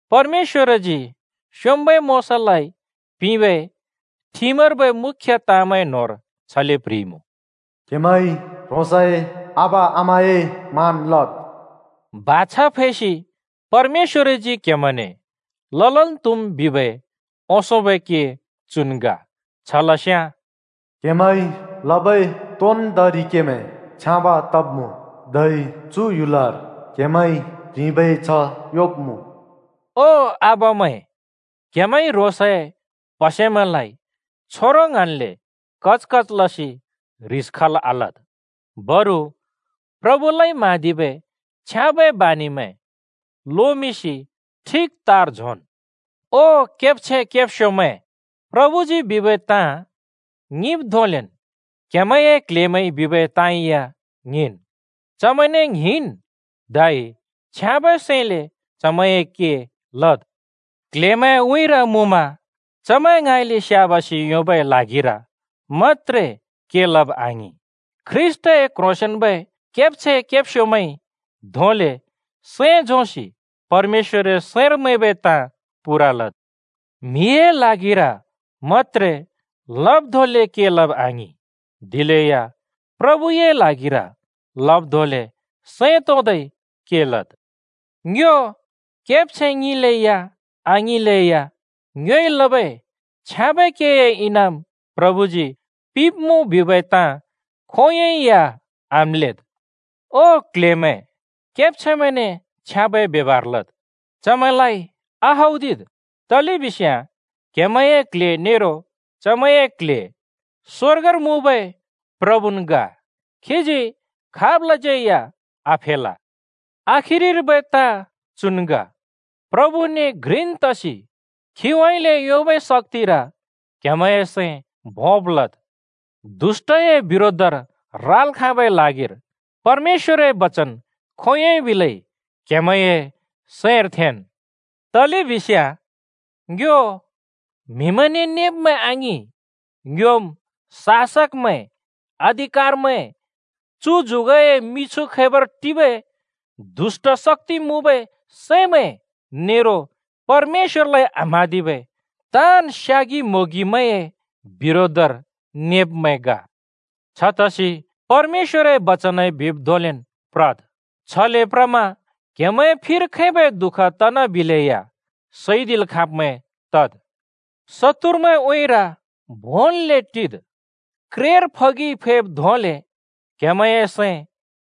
परमेश्‍वरजी स्‍योंम्‍बै मोशालाइ पिंबै ठिमर्बै मुख्‍य ताँमैं न्होंर छले प्ह्रिइमुँ, “क्‍हेमैंइ ह्रोंसए आबा-आमाए मान लद्।” बाछा फैसि परमेश्‍वरजी क्हेमैंने ललन् त्हुम् बिबै ओंसोंबै के चुन् ग। छ लस्याँ “क्‍हेमैंइ लबै तोन्दोंरि केमैं छ्याँब तब्‍मुँ, धै चु ह्‍युलर क्‍हेमैंइ ह्रिंबै छ्ह योंब्‍मुँ।” ओ आबामैं, क्‍हेमैंइ ह्रोंसए प्हसेमैंलाइ छोरों ङ्हाँन्ले कच कच लसि ह्रिस खल् आलद्। बरु प्रभुलाइ म्हाँदिबै छ्याँबै बानि लोमिंसि ठिक तार झोंन्। ओ केब्छैं केब्स्योमैं, प्रभुजी बिबै ताँ ङिंब् धोंलेन् क्‍हेमैंए क्ल्हेमैंइ बिबै ताँ या ङिंन्। चमैंने ङ्हिंन् धै छ्याँबै सैंले चमैंए के लद्। क्ल्हेमैंए उँइँर मुँमा चमैं ङाँइले स्‍याबासि योंबै ल्हागिर मत्‍त्रे के लब आङिं, ख्रीष्‍टए क्ह्रोंसेंन्बै केब्छैं केब्स्योमैंइ धोंले सैं झोंसि परमेश्‍वरए सैंर मैंबै ताँ पूरा लद्। म्हिए ल्हागिर मत्‍त्रे लब् धोंले के लब आङिं, दिलेया प्रभुए ल्हागिर लब् धोंले सैं तोंदै के लद्। ङ्यो केब्छैं ङिंले या आङिंले या, ङ्योइ लबै छ्याँबै केए इनाम प्रभुजी पिंब्‍मुँ बिबै ताँ खोंयोंइ या आम्‍लेद्। ओ क्ल्हेमैं, केब्छैंमैंने छ्याँबै ब्यबहार लद्, चमैंलाइ आहौदिद्, तलेबिस्याँ क्‍हेमैंए क्ल्हे नेरो चमैंए क्ल्हे स्‍वर्गर मुँबै प्रभुन् ग। खीजी खाबलाज्यै या आफेल। आखिरिर्बै ताँ चुन् ग: प्रभुने घ्रिन् तसि खीउँइँले योंबै शक्‍तिर क्‍हेमैंए सैं भोंब् लद्। दुष्‍टए बिरोधर राल् खाँबै ल्हागिर परमेश्‍वरए बचन खोंयोंन् बिलै क्हेमैंए सैंर थेंन्। तलेबिस्याँ ङ्यो म्‍हिमैंने नेब्मैं आङिं, ङ्योम् शासकमैं, अधिकारमैं, चु जुगए मिछु खैबर टिबै दुष्‍ट शक्‍ति मुँबै सैमैं नेरो परमेश्‍वरलाइ आम्‍हाँदिबै ताँन् स्‍यागि-म्‍होंगिमैंए बिरोधर नेब्मैं ग। छतसि परमेश्‍वरए बचनइ बिब् धोंलेन् प्रद्। छले प्रसि क्हेमैंए फिर खैबै दु:ख तना बिलेया सैदिल् खाँब्मैं तद्। शत्तुरमैंए उँइँर भोंन्‍ले टिद्। क्रेर फगिइ फैब् धोंले क्हेमैंए सैं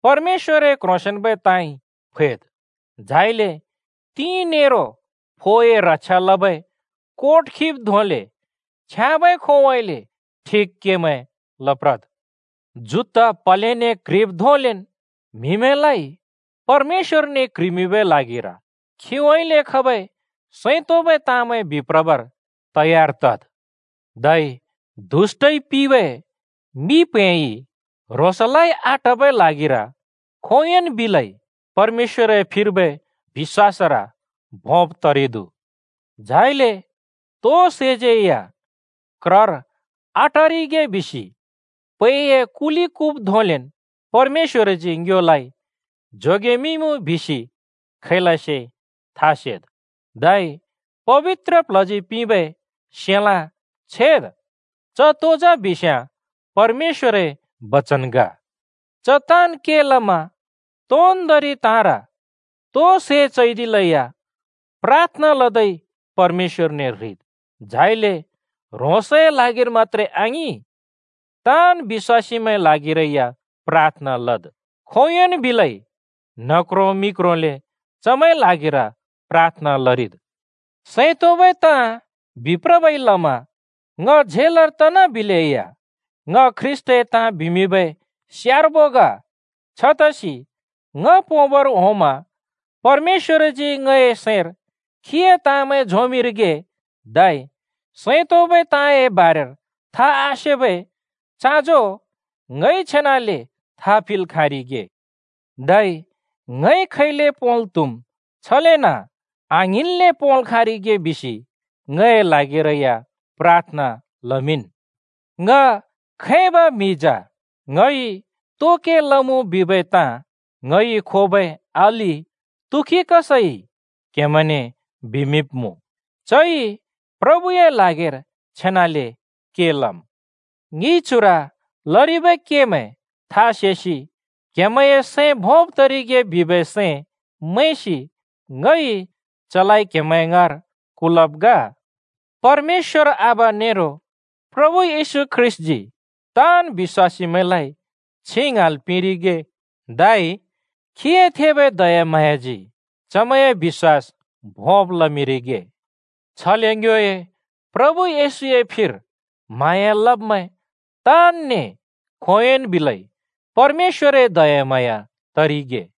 परमेश्‍वरए क्ह्रोंसेंन्बै ताँइ फैद्। झाइले तिं नेरो फोए रक्षा लबै कोट खिब् धोंले छ्याँबै खोंउँइँले ठिक केमैं लप्रद्। जुत्ता प्हलेने क्ह्रिब् धोंलेन् म्हिमैंलाइ परमेश्‍वरने क्ह्रिमिंबै ल्हागिर खीउँइँले खबै सैं तोंबै ताँमैं बिप्रबर तयार तद्। धै दुष्‍टइ पिबै मि प्हैंइ ह्रोंसलाइ आटबै ल्हागिर खोंयोंन् बिलै परमेश्‍वरए फिर्बै बिश्‍वासर भोंब तरिदु। झाइले तो सैज्यै या क्रर आटरिगे बिसि पैए कुले कुब् धोंलेन् परमेश्‍वरजी ङ्योलाइ जोगेमिंइमुँ बिसि खैलसे था सेद्। धै पबित्र प्ल्हजी पिंबै सेलाँ छेद्। च तो जा बिस्याँ परमेश्‍वरए बचन ग। च ताँन् के लमा तोन्‍दोंरि ताँर तो सै चैदिले या प्राथना लदै परमेश्‍वरने ह्रिद्। झाइले ह्रोंसए ल्हागिर मत्‍त्रे आङिं, ताँन् बिश्‍वासीमैंए ल्हागिरै या प्राथना लद्, खोंयोंन् बिलै न्ह क्रों मि क्रोंले चमैंए ल्हागिर प्राथना लरिद्। सैं तोंबै ताँ बिप्रबै लमा ङ झेलर तनाबिलेया ङ ख्रीष्‍टए ताँ बिमिंबै स्यार्बो ग। छतसि ङ पोंबर होंमा परमेश्‍वरजी ङए सैंर खीए ताँमैं झोंमिंरिगे, धै सैं तोंबै ताँए बारेर था आसेबै चाँजो ङइ छेनाले था पिंल् खाँरिगे, धै ङइ खैले पोंल् त्हुम् छलेन आङ्हिंन्ले पोंल् खाँरिगे बिसि ङए ल्हागिरै या प्राथना लमिंन्। ङ खैबै म्हि जा, ङइ तो के लमुँ बिबै ताँ ङइ खोबै अलि तुखिकसइ क्‍हेमैंने बिमिंब्मुँ। चइ प्रभुए ल्हागिर छेनाले के लम्। ङिइ चुर लरिबै केमैं था सेसि क्हेमैंए सैं भोंब् तरिगे बिबै सैं मैंसि ङइ चलाइ क्हेमैं ङाँर कुलब् ग। परमेश्‍वर आबा नेरो प्रभु येशू ख्रीष्‍टजी ताँन् बिश्‍वासीमैंलाइ छिं ङ्हाँल् पिंरिगे धै खीए थेबै दयाम्हाँयाजी चमैंए बिश्‍वास भोंब् लमिंरिगे। छले ङ्योए प्रभु येशूए फिर म्हाँया लब्मैं ताँनने खोंयोंन् बिलै परमेश्‍वरए दयाम्हाँया तरिगे।